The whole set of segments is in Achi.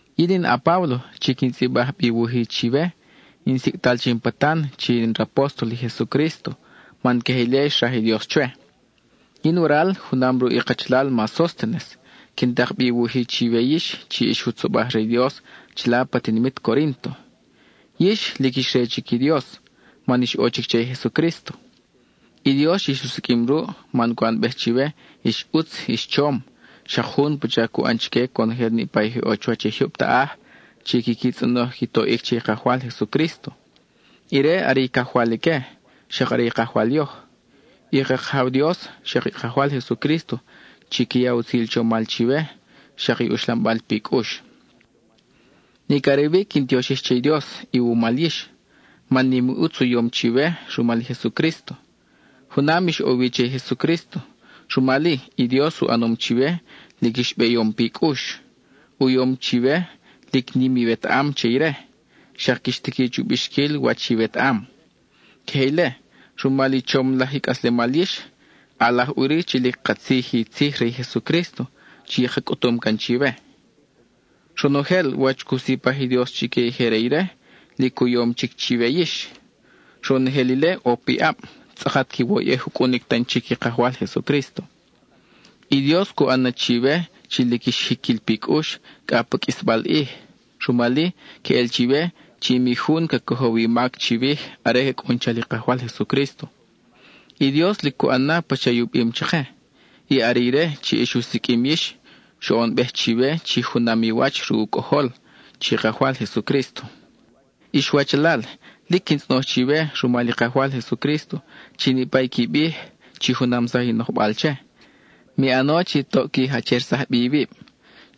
Yin in a-Páblo chi quin tzʼibaj bi i wuj-i chiwe. In sicʼtal che in patan chi in rapóstol i Jesucrísto man queje ile xraj i Dios chwe. Yin waral, junam ruʼ i kachalal ma Sóstenes, quin tak bi wuj-i chiwe yix chi ix jutzobaj re i Dios chila pa tinimit Corínto. Yix, lic ix re chic i Dios, man ix ʼo chic che i Jesucrísto. I Dios ix u siqʼuim ruʼ man cu ʼanbej chiwe ix ʼutz ix chom, xak jun pacha cu ʼan chique conojel niʼpa i je ʼo chuwach i jyub taʼaj chi quiqui tzʼonoj qui toʼic che i Kajwal Jesucrísto; ire are i Cajwal ique, xak are i Kajwal yoj. I ka Kajaw Dios, xak i Kajwal Jesucrísto, chiqui ya utzil chomal chiwe, xak i uxlambal pi cʼux. Nic are wi quin tioxij che i Dios iwumal yix, man nim i ʼutz u yom chiwe rumal i Jesucrísto. Junam ix ʼo wi che i Jesucrísto, rumal-i, i Dios u ʼanom chiwe lic ix beyom pi cʼux; u yom chiwe lic nim iwetaʼam che ire, xak quix tiqui chu bixquil wach iwetaʼam. Queje ile, rumal i chom laj i cʼaslemal yix, ʼalaj ʼuri chi lic katzij i tzij re i Jesucrísto chi ka cʼutum can chiwe. Ronojel wach cu sipaj i Dios chique i je re ire, lic u yom chic chiwe yix. Ronojel ile ʼo piʼab, tzʼakat quiwoyʼej u cʼunic tan chic i Kajwal Jesucrísto. I Dios cu ʼan na chiwe chi lic ix jiquil pi cʼux cʼa pa qʼuisbal ʼij, rumal-i, queʼel chiwe chi mi jun ca cojow i mac chiwij are ca cʼun chal i Kajwal Jesucrísto. I Dios lic cu ʼan na pacha i u bim chake, y are ire chi ix u siqʼuim yix, xoʼonbej chiwe chi junam i wach ruʼ u Cʼojol, chi Kajwal Jesucrísto. Ix wachalal, lic quin tzʼonoj chiwe rumal i Kajwal Jesucrísto, chi niʼpa i qui bij, chi junamsaj i nojbal che; mi ʼano chi toʼ qui jachersaj bi iwib.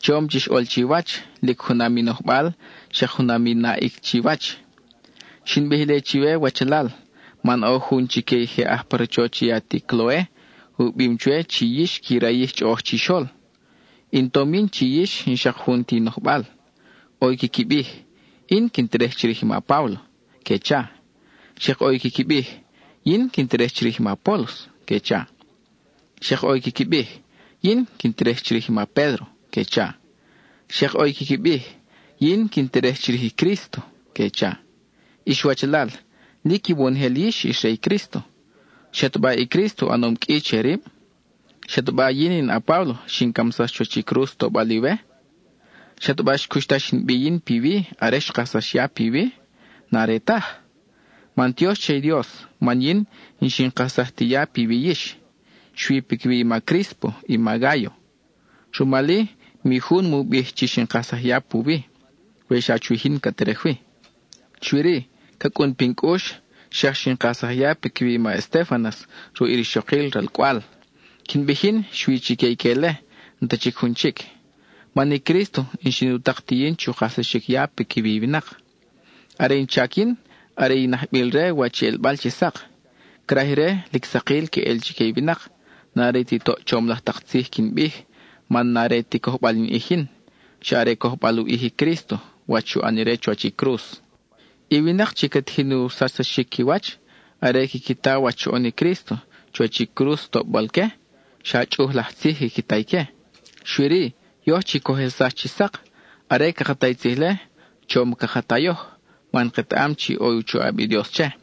Chom chix ʼol chiwach, lic junam i nojbal, xak junam i naʼic chiwach. Xin bij ile chiwe wachalal, man ʼo jun chique i je aj pa rachoch i ati Cloe, u bim chwe chi yix qui rayij chʼoʼoj chixol. In tom yin chi yix n-xak jun ti i nojbal; ʼo i quiqui bij: “Yin quin terej chirij i ma Páblo,” que cha. Xak ʼo i quiqui bij: “Yin quin terej chirij i ma Apólos,” que cha. Xak ʼo i quiqui bij: “Yin quin terej chirij i ma Pédro,” que cha. Xak ʼo i quiqui bij: “Yin quin terej chirij i Crísto,” que cha. Ix wachalal, lic iwonojel yix ix re i Crísto. ¿Xataba i Crísto u ʼanom qʼui che rib? ¿Xataba yin a-Páblo xin camsax chuwach cruz tobal iwe? ¿Xataba xcuxtax in bi yin piwi are xkajsax ya piwi? N-are taj. Mantiox che i Dios man yin n-xin kajsaj ti ya piwi yix, xui piquiwi i ma Críspo i ma Gáyo. Rumal-i, mi jun mu bij chi xin kajsaj ya puwi, we xa chwij yin ca terej wi. Xui-ri, ca cʼun pin cʼux, xak xin kajsaj ya piquiwi i ma Estéfanas ruʼ i rixokil ralcʼwal. Quin bij yin, xui chique ique-le, n-ta chic jun chic. Man i Crísto n-xin u tak ti yin chu kajsaxic ya piquiwi i winak. Are in chac yin, are in ajbil-re wach i ʼelbal chi sak. Craj ire, lic sakil queʼel chique i winak, n-are ti toʼ chom laj tak tzij quin bij, man n-are ti cojbal in ʼij yin, xa are cojbal u ʼij i Crísto, wach xu ʼan ire chuwach i cruz. I winak chi ca tijin u sachsaxic qui wach, are quiqui ta wach xoʼon i Crísto chuwach i cruz tobal-que, xa chʼuj laj tzij quiqui ta ique. Xui-ri, yoj chi coj ʼelsax chi sak, are caka ta i tzij-le, chom caka ta yoj, man ketaʼam chi ʼo i u choʼab i Dios che.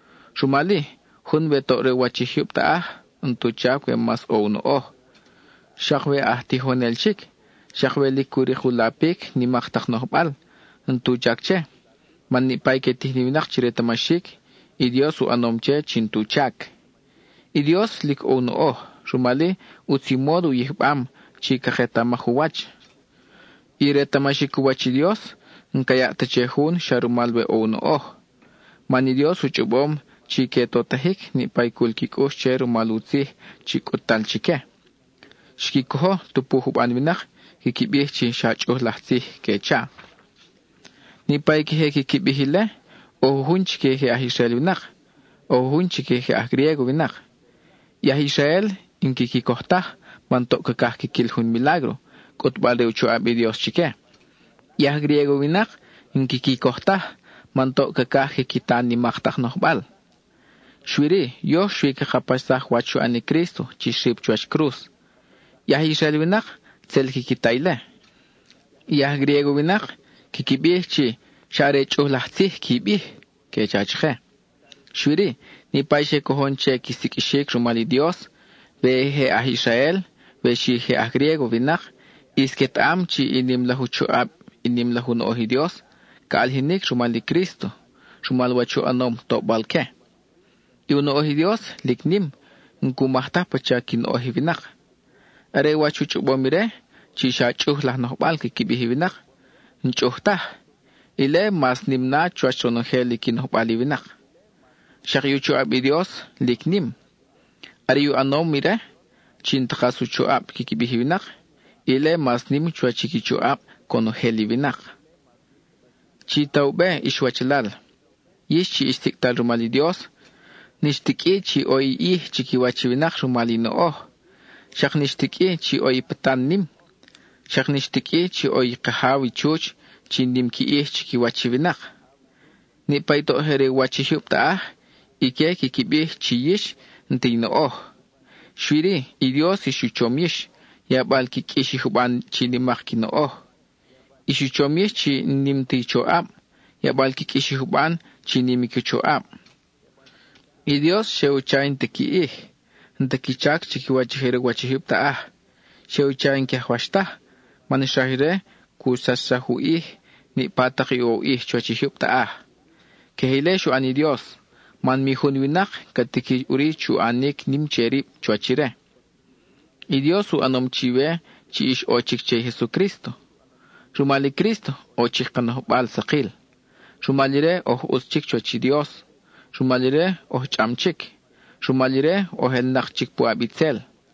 Rumal-i, jun we toʼ re u wach i jyub taʼaj, n-tu chac we mas ʼo u noʼoj; xak we aj tijonel chic, xak we lic cu rik u lapic nimak tak nojbal, n-tu chac che, man niʼpa i que tijin i winak chi retamaxic, i Dios u ʼanom che chi n-tu chac. I Dios lic ʼo u noʼoj; rumal-i, ʼutz i módo u yijbam chi caketamaj u wach; i retamaxic u wach i Dios, n-ca yaʼ ta che jun xa rumal we ʼo u noʼoj. Man i Dios u chʼobom chi que totajic niʼpa i cul qui cʼux che rumal u tzij chi cʼut-tal chique. Xqui cojo, tupu i juban winak quiqui bij chi xa chʼuj laj tzij, que cha. Niʼpa i queje quiqui bij ile, ʼo jujun chique je aj Israel winak, ʼo jujun chique je aj Griégo winak. I aj Israel n-quiqui coj taj man toʼ cacaj quiquil jun milágro, cʼutbal re u choʼab i Dios chique. I aj Griégo winak n-quiqui coj taj, man toʼ cacaj quiqui ta nimak tak nojbal. Xui-ri, yoj xui caka paxsaj wach xu ʼan i Crísto chi xrip chuwach cruz. I aj Israel winak, tzel quiqui ta ile; i aj Griégo winak quiqui bij chi “xa are chʼuj laj tzij qui bij,” que cha chake. Xui-ri, niʼpa i xe cojon che qui siqʼuixic rumal i Dios, we je aj Israel, we xi je aj Griégo winak, ʼis quetaʼam chi i nim laj u choʼab, i nim laj u noʼoj i Dios, ca ʼalijinic rumal i Crísto (rumal wach u ʼanom tobal-que). I u noʼoj i Dios, lic nim, n-cu maj taj pacha qui noʼoj i winak. Are wach u chʼobom ire, chi xa chʼuj laj nojbal quiqui bij i winak, n-chʼuj taj; ile mas nim na chuwach ronojel i qui nojbal i winak. Xak i u choʼab i Dios, lic nim. Are i u ʼanom ire, chi n-ta kas u choʼab quiqui bij i winak, ile mas nim chuwach i qui choʼab conojel i winak. Chi ta u be ix wachalal, yix chi ix sicʼtal rumal i Dios, n-ix ti qʼui chi ʼo i ʼij chiquiwach i winak rumal i noʼoj. Xak n-ix ti qʼui chi ʼo i patan nim; xak n-ix ti qʼui chi ʼo i kajaw i chuch chi nim qui ʼij chiquiwach i winak. Niʼpa i toʼ je re u wach i jyub taʼaj, ique quiqui bij chi yix n-ta i noʼoj, xui-ri, i Dios ix u chom yix, yabal qui qʼuix i juban chi nimak qui noʼoj. Ix u chom yix chi n-nim ta i choʼab, yabal qui qʼuix i juban chi nim i qui choʼab. I Dios xe u cha i n-ta qui ʼij, n-ta qui chac chiquiwach i je re u wach i jyub taʼaj, xe u cha i n-que ajwax taj man xraj ire cu sachsaj u ʼij niʼpa tak i ʼo u ʼij chuwach i jyub taʼaj. Queje ile xu ʼan i Dios, man mi jun winak ca tiqui ʼuri chu ʼanic nim che rib chuwach ire. I Dios u ʼanom chiwe chi ix ʼo chic che i Jesucrísto. Rumal i Crísto, ʼo chic ka nojbal sakil; rumal ire oj ʼutz chic chuwach i Dios; rumal ire oj chʼam chic; rumal ire oj ʼelnak chic puʼab itzel.